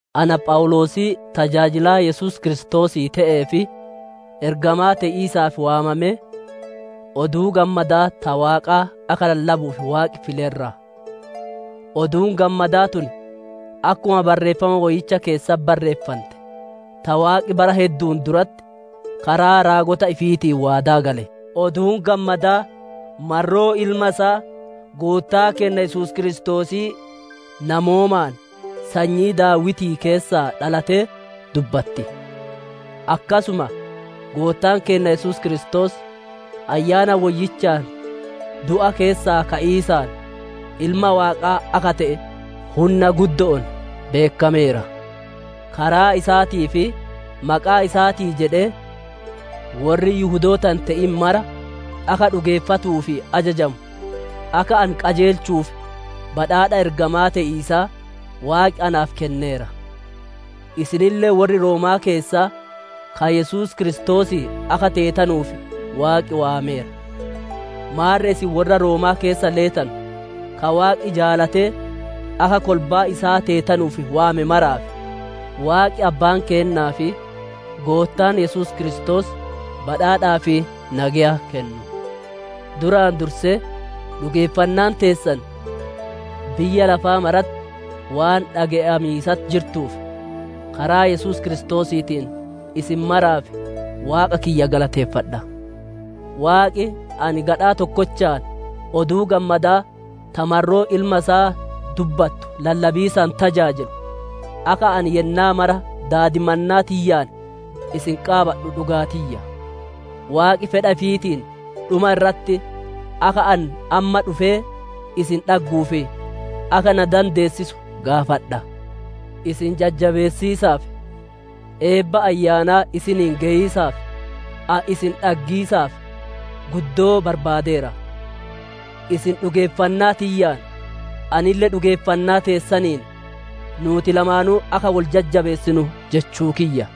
Ana Phawuloosii tajaajilaa Yesuus Kiristoosii te'ee fi ergamaa te'iisaaf waamamee, Oduu Gammadaa ta Waaqaa akka lallabuuf Waaqi file irraa: Oduun Gammadaa tun akkuma Barreeffama Woyyicha keessatti barreeffante, ta Waaqi bara heddu'uun duratti karaa raagota ifiitiin waadaa gale. Oduun Gammadaa marroo Ilma isaa, Goottaa keenna Yesuus Kiristoosii, namoomaan sanyii Daawitii keessaa dhalatee dubbatti; akkasuma Goottaan keenna Yesuus Kiristoos Ayyaana Woyyichaan du'a keessaa ka'iisaan, Ilma Waaqaa akka te'e hunna guddo'oon beekkameera. Karaa isaatii fi maqaa isaatii jedhee, worri Yihudoota hin te'in mara akka dhugeeffatuu fi ajajamu, akka ani qajeelchuuf badhaadha ergamaa te'iisaa, Waaqi naaf kenneera. Isinille worri Roomaa keessaa, ka Yesuus Kiristoosii akka teetanuuf Waaqi waameera. Maarre isin worra Roomaa keessa leetanu, ka Waaqi jaalatee akka kolbaa isaa teetanuuf waame maraaf: Waaqi Abbaan keennaa fi Goottaa Yesuus Kiristoos badhaadhaa fi nageya kennu. Duraan dursee, dhugeeffannaan teessan biyya lafaa maratti waan dhage'amiisatti jirtuuf, karaa Yesuus Kiristoosiitiin isin maraaf Waaqa kiyya galateeffadha. Waaqi ani gadhaa tokkochaan Oduu Gammadaa ta marroo Ilma isaa dubbattu lallabiisaan tajaajilu, akka ani yennaa mara daadimannaa tiyyaan isin qaabadhu dhugaa tiyya. Waaqi fedha ifiitiin dhuma irratti akka ani amma dhufee isin dhagguuf akka na dandeessisu gaafadha. Isin jajjabeessiisaaf, eebba Ayyaanaa isiniin geyiisaaf, ani isin dhaggiisaaf guddoo barbaadeera. Isin dhugeeffannaa tiyyaan anille dhugeeffannaa teessaniin, nuuti lamaanuu akka wol jajjabeessinu jechuu kiyya.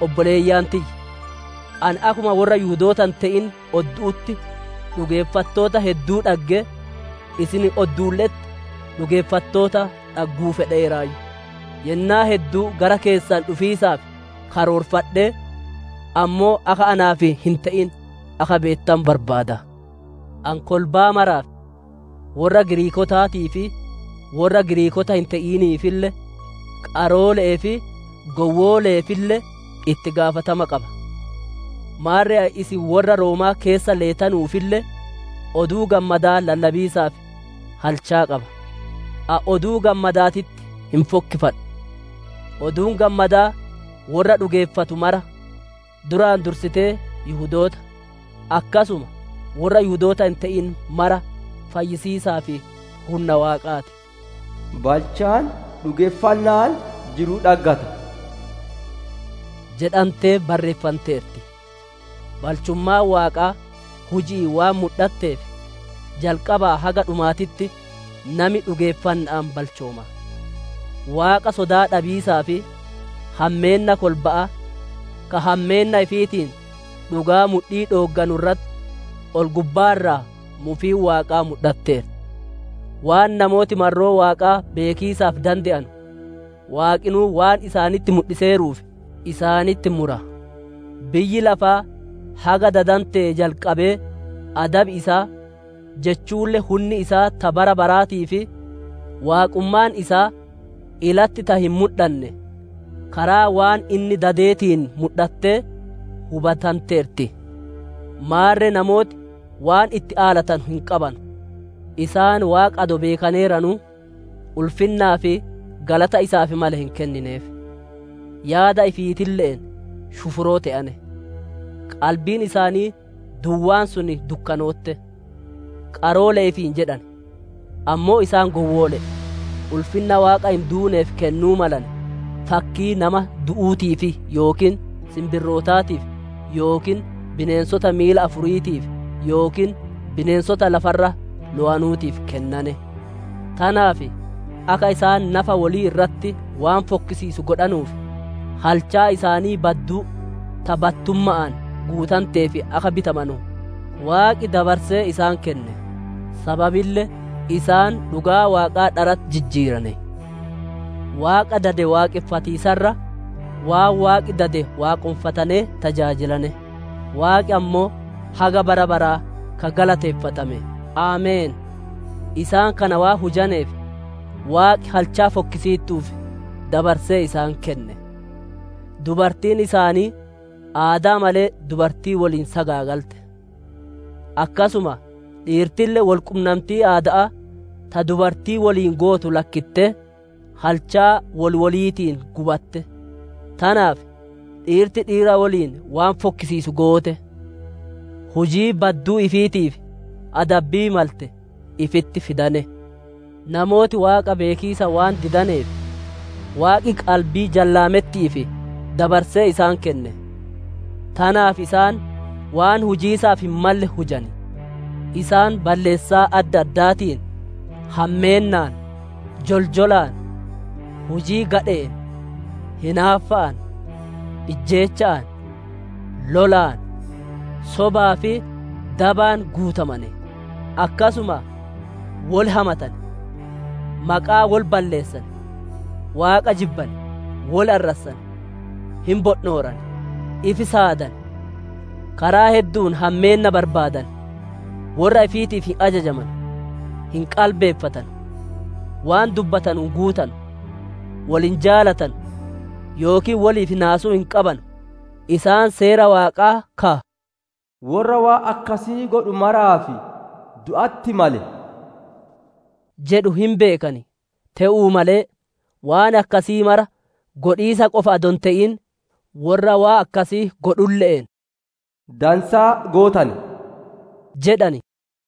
Obboleeyyan tiyya! Ani akkuma worra Yihudoota hin te'in oddu'utti dhugeeffattoota hedduu dhagge, isin odduulle'etti dhugeeffattoota dhagguu fedheeraayyu; yennaa hedduu gara keessan dhufiisaaf karoorfadhee, ammoo akka naaf hin te'in akka beettanu barbaada. Ani kolbaa maraaf, worra Giriikootaatii fi worra Giriikoota hin te'iniifille, qaroole'ee fi gowwoole'eefille itti gaafatama qaba. Maarre ani isin worra Roomaa keessa leetanuufille, Oduu Gammadaa lallabiisaaf halchaa qaba. Ani Oduu Gammadaatitti hin fokkifadhu; Oduun Gammadaa worra dhugeeffatu mara: duraan dursitee Yihudoota, akkasuma worra Yihudoota hin te'in mara fayyisiisaaf hunna Waaqaa ti. «Balchaan dhugeeffanna'aan jiruu dhaggata» jedhantee barreeffanteerti; balchummaan Waaqaa huji'iin waan mudhatteef, jalqabaa haga dhumaatitti nami dhugeeffanna'aan balchooma. Waaqa sodaa dhabiisaa fi hammeenna kolba'aa, ka hammeenna ifiitiin dhugaa mudhii dhoogganu irratti, ol-gubbaa irraa mufiin Waaqaa mudhatteerti. Waan namooti marroo Waaqaa beekiisaaf dande'anu, Waaqinuu waan isaanitti mudhiseeruuf, isaanitti mura. Biyyi lafaa haga dadantee jalqabee adabi isaa, jechuulle hunni isaa ta bara baraatii fi Waaqummaan isaa ilatti ta hin mudhanne, karaa waan inni dadeetiin mudhattee hubatanteerti; maarre namooti waan itti aalatanu hin qabanu. Isaan Waaqa adoo beekaneeranu, ulfinnaa fi galata isaaf male hin kennineef; yaada ifiitille'een shufuroo te'ane; qalbiin isaanii duwwaan sun dukkanootte. Qaroolee ifiin jedhan, ammoo isaan gowwoole'e; ulfinna Waaqa hin duuneef kennuu malane, fakkii nama du'uutiif yookiin sinbirrootaatiif yookiin bineensota miila afuriitiif yookiin bineensota lafa irra lowanuutiif kennane. Tanaaf akka isaan nafa wolii irratti waan fokkisiisu godhanuuf, halchaa isaanii badduu ta battumma'aan guutanteef akka bitamanu Waaqi dabarsee isaan kenne. Sababille isaan dhugaa Waaqaa dharatti jijjiirane; Waaqa dade waaqonfatiisa irra waan Waaqi dade waaqonfatanee tajaajilane; Waaqi ammoo haga bara baraa ka galateeffame! Ameen. Isaan kana waan hujaneef, Waaqi halchaa fokkisiittuuf dabarsee isaan kenne. Dubartiin isaanii aadaa malee dubartii woliin sagaagalte. Akkasuma dhiirtille wol qunnamtii aada'aa ta dubartii woliin gootu lakkittee, halchaa wol woliitiin gubatte. Tanaaf dhiirti dhiira woliin waan fokkisiisu goote; hujii badduu ifiitiif adabbii malte ifitti fidane. Namooti Waaqa beekiisa waan didaneef, Waaqi qalbii jallaametti'iif dabarsee isaan kenne; tanaaf isaan waan hujiisaaf hin malle hujan. Isaan balleessaa adda addaatiin, hammeennaan, joljolaan, hujii gadhe'een, hinaaffa'aan, ijjeecha'aan, lolaan, sobaa fi dabaan guutamane. Akkasuma wol hamatan, maqaa wol balleessan, Waaqa jibban, wol arrassan, hin bondhooran, ifi saadan, karaa heddu'uun hammeenna barbaadan, worra ifiitiif hin ajajamanu, hin qalbeeffatanu, waan dubbatanu hin guutanu, woli hin jaalatanu yookiin woliif naasuu hin qabanu. Isaan Seera Waaqaa ka, «Worra waan akkasii godhu maraaf du'atti male» jedhu hin beekan. Te'uu malee, waan akkasii mara godhiisa qofa adoo hin te'in, worra waan akkasii godhulle'een, «Dansaa gootane» jedhan.